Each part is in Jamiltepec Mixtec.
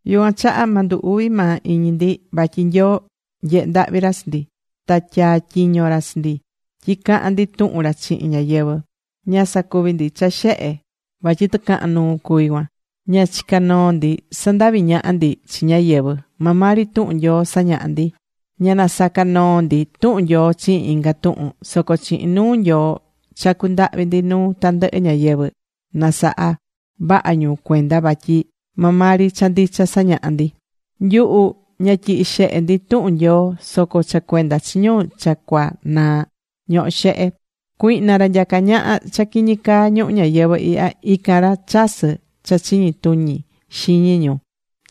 Yucuan chaha ma ndu uvi maa iñi ndi, vatyi Nyoo nyehé ndahvi ra chi ndi. Ta tyaa̱ tyiño ra chi ndi tyi cahan ndi tuhun ra chihin ñáyɨvɨ. Ña sacuví ndi cha xehe vatyi tɨcahan nuu cuví cuan. Ña chicá noo ndi sandaví ñaha ndi chi ñáyɨvɨ. Maa maa ri tuhun Nyoo sañahá ndi. Ña nasacá noo ndi tuhun Nyoo chihin inga tuhun. Soco chihin nuu Nyoo chacú ndahvi ndi nuu tandɨhɨ ñáyɨvɨ, na saha vaha ñu cuenda vatyi maa maa ri cha ndicha sañahá ndi. Nyuhu ña tyihí xehe ndi tuhun Nyoo. Soco cha cuenda chi ñu cha cua cunaa ñohó xehe. Cuihna, ra nyacá ñaha cha quiñi caa ñuhu ñayɨvɨ ihya, ican ra chasɨ́ cha chiñi tuñi xiñi ñu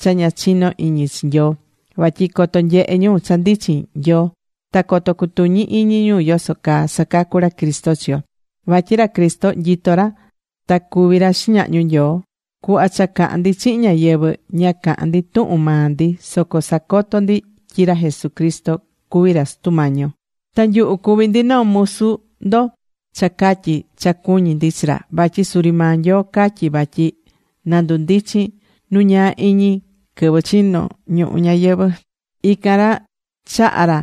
cha ña chinó iñi chi Nyoo. Vatyi coto nyehe ñu cha ndichin Nyoo. Ta coto cutuñi iñi ñu yoso caa sacacú ra Cristo chi yo. Vatyi ra Cristo nyitó ra ta cuví ra xiñahñu Nyoo. Cuhva cha cahán ndi chihin ñáyɨvɨ, ña cahán ndi tuhun maa ndi. Soco sacotó ndi tyi ra Jesucristo cuví ra Sutu Mañi yo. Ta nyuhu cuví ndi noo musu ndo cha catyi cha cuñí ndi chi ra. Vatyi suri maa Nyoo catyí vatyi na ndundichin nu ñaa iñi quɨvɨ chino̱ ñuhu ñayɨvɨ̱. Ican ra chaha̱ ra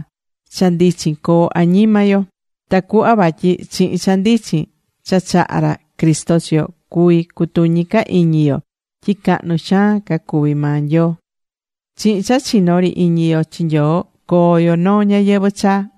cha ndichin coo añima yo, tacuhva vatyi chihin cha ndichin cha chaha̱ ra Cristo chi yo, cuví cutuñi ca iñi yo tyi cahnu xaan ca cuví maa Nyoo.Chihin cha chinó ri iñi yo chi Nyoo coo yo noo ñayɨvɨ̱ chaa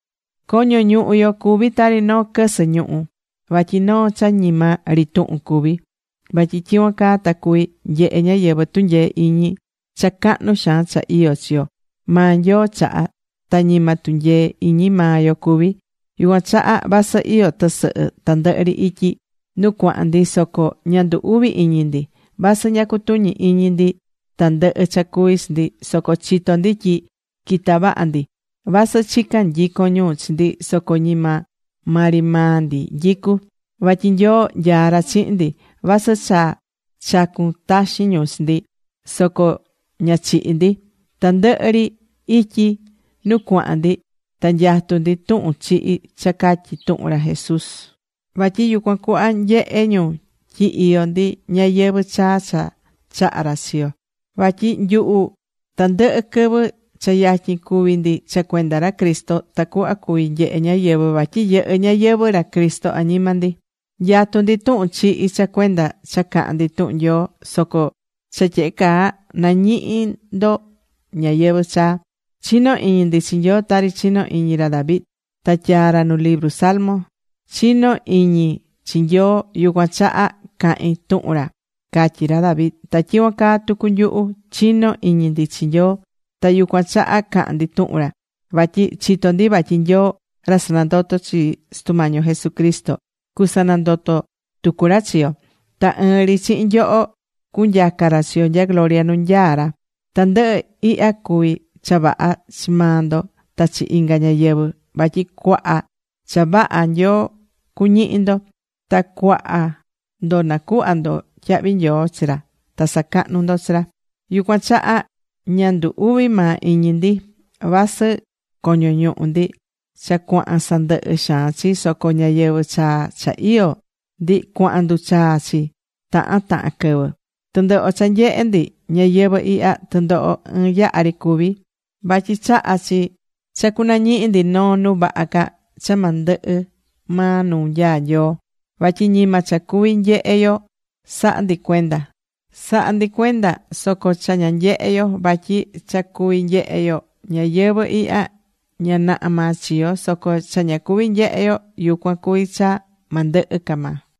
Coño ñuhu yo cuví tari noo quɨsɨ ñuhú, vatyi noo cha ñima ri tuhun cuví. Vatyi tyicuan caa ta cuví nyehe ñáyɨvɨ tunyee iñi cha cahnu xaan cha iyó chi yo, maa Nyoo chahá, ta ñima tunyee iñi maa yo cuví. Yucuan chaha vasɨ iyó tɨsɨhɨ tandɨhɨ ri ityi nu cuahán ndi, soco ña ndu uví iñi ndi. Vasɨ ña cutuñí iñi ndi tandɨhɨ cha cuví chi ndi, soco chitó ndi tyi quitá vaha ndi. Vasɨ chicá nyicon ñu chi ndi soco ñima maa ri maa ndi nyicu. Vatyi Nyoo nyaá ra chihin ndi. Vasɨ cha chacun taxin ñu chi ndi soco ña chihí ndi. Tandɨhɨ ri ityi nu cuahán ndi ta nyatú ndi tuhun chihi cha catyi tuhun ra Jesús. Vatyi yucuan cuhva nyehé ñu tyi iyó ndi ñayɨvɨ̱ chaa cha chahá ra chi yo. Vatyi nyuhu tandɨhɨ quɨvɨ, cha yatyin cúvi ndi cha cuenda ra Cristo tacuhva cuví nyehe ñáyɨvɨ vatyi yɨhɨ́ ñayɨvɨ̱ ra Cristo añima ndi. Nyatú ndi tuhun chihi cha cuenda cha cahán ndi tuhun Nyoo. Soco cha tyehe caa, nañihí ndo ñayɨvɨ̱ chaa. Chinó iñi ndi chi Nyoo tari chino̱ iñi ra David. Ta tyaa̱ ra nu libru Salmos: “Chinó iñi chi Nyoo, yucuan chaha cahín tuhun ra”, catyi̱ ra David. Ta tyicuan caa tucu nyuhu. Chinó iñi ndi chi Nyoo. Ta yucuan chaha cahán ndi tuhun ra. Vatyi chitó ndi vatyi Nyoo ra sanandoto̱ chi Sutu Mañi yo Jesucristo, cusanandoto tucu ra chi yo. Ta ɨɨn ri chihin nyoho, cunyaca ra chi yo nya gloria nu nyaá ra. Tandɨhɨ ihya cuví cha vaha chi maa ndo ta chi inga ñáyɨvɨ. Vatyi cuaha cha vaha Nyoo cuñihi ndo. Ta cuaha ndo nacuhvá ndo tyahvi nyoo chi ra, ta sacahnú ndo chi ra. Yucuan chaha ña ndu uví maa iñi ndi. Vasɨ coño ñuhu ndi cha cuahán sandɨhɨ xaan chi. Soco ñayɨvɨ̱ chaa cha iyó ndi cuahán nduchaa chi tahan tahan quɨvɨ. Tɨndoho cha nyehé ndi ñayɨvɨ̱ ihya, tɨndoho ɨɨn yaha ri cuví. Vatyi chahá chi cha cunañihi ndi noo nu vaha ca cha ma ndɨhɨ maa nu nyaá Nyoo. Vatyi ñima cha cuví nyehe yo sahá ndi cuenda. Sahá ndi cuenda soco cha ña nyehé yo. Vatyi cha cuví nyehé yo ñayɨvɨ̱ ihya, ña naha maa chiyo̱. Soco cha ña cuví nyehé yo, yucuan cuví cha ma ndɨhɨ ca maa.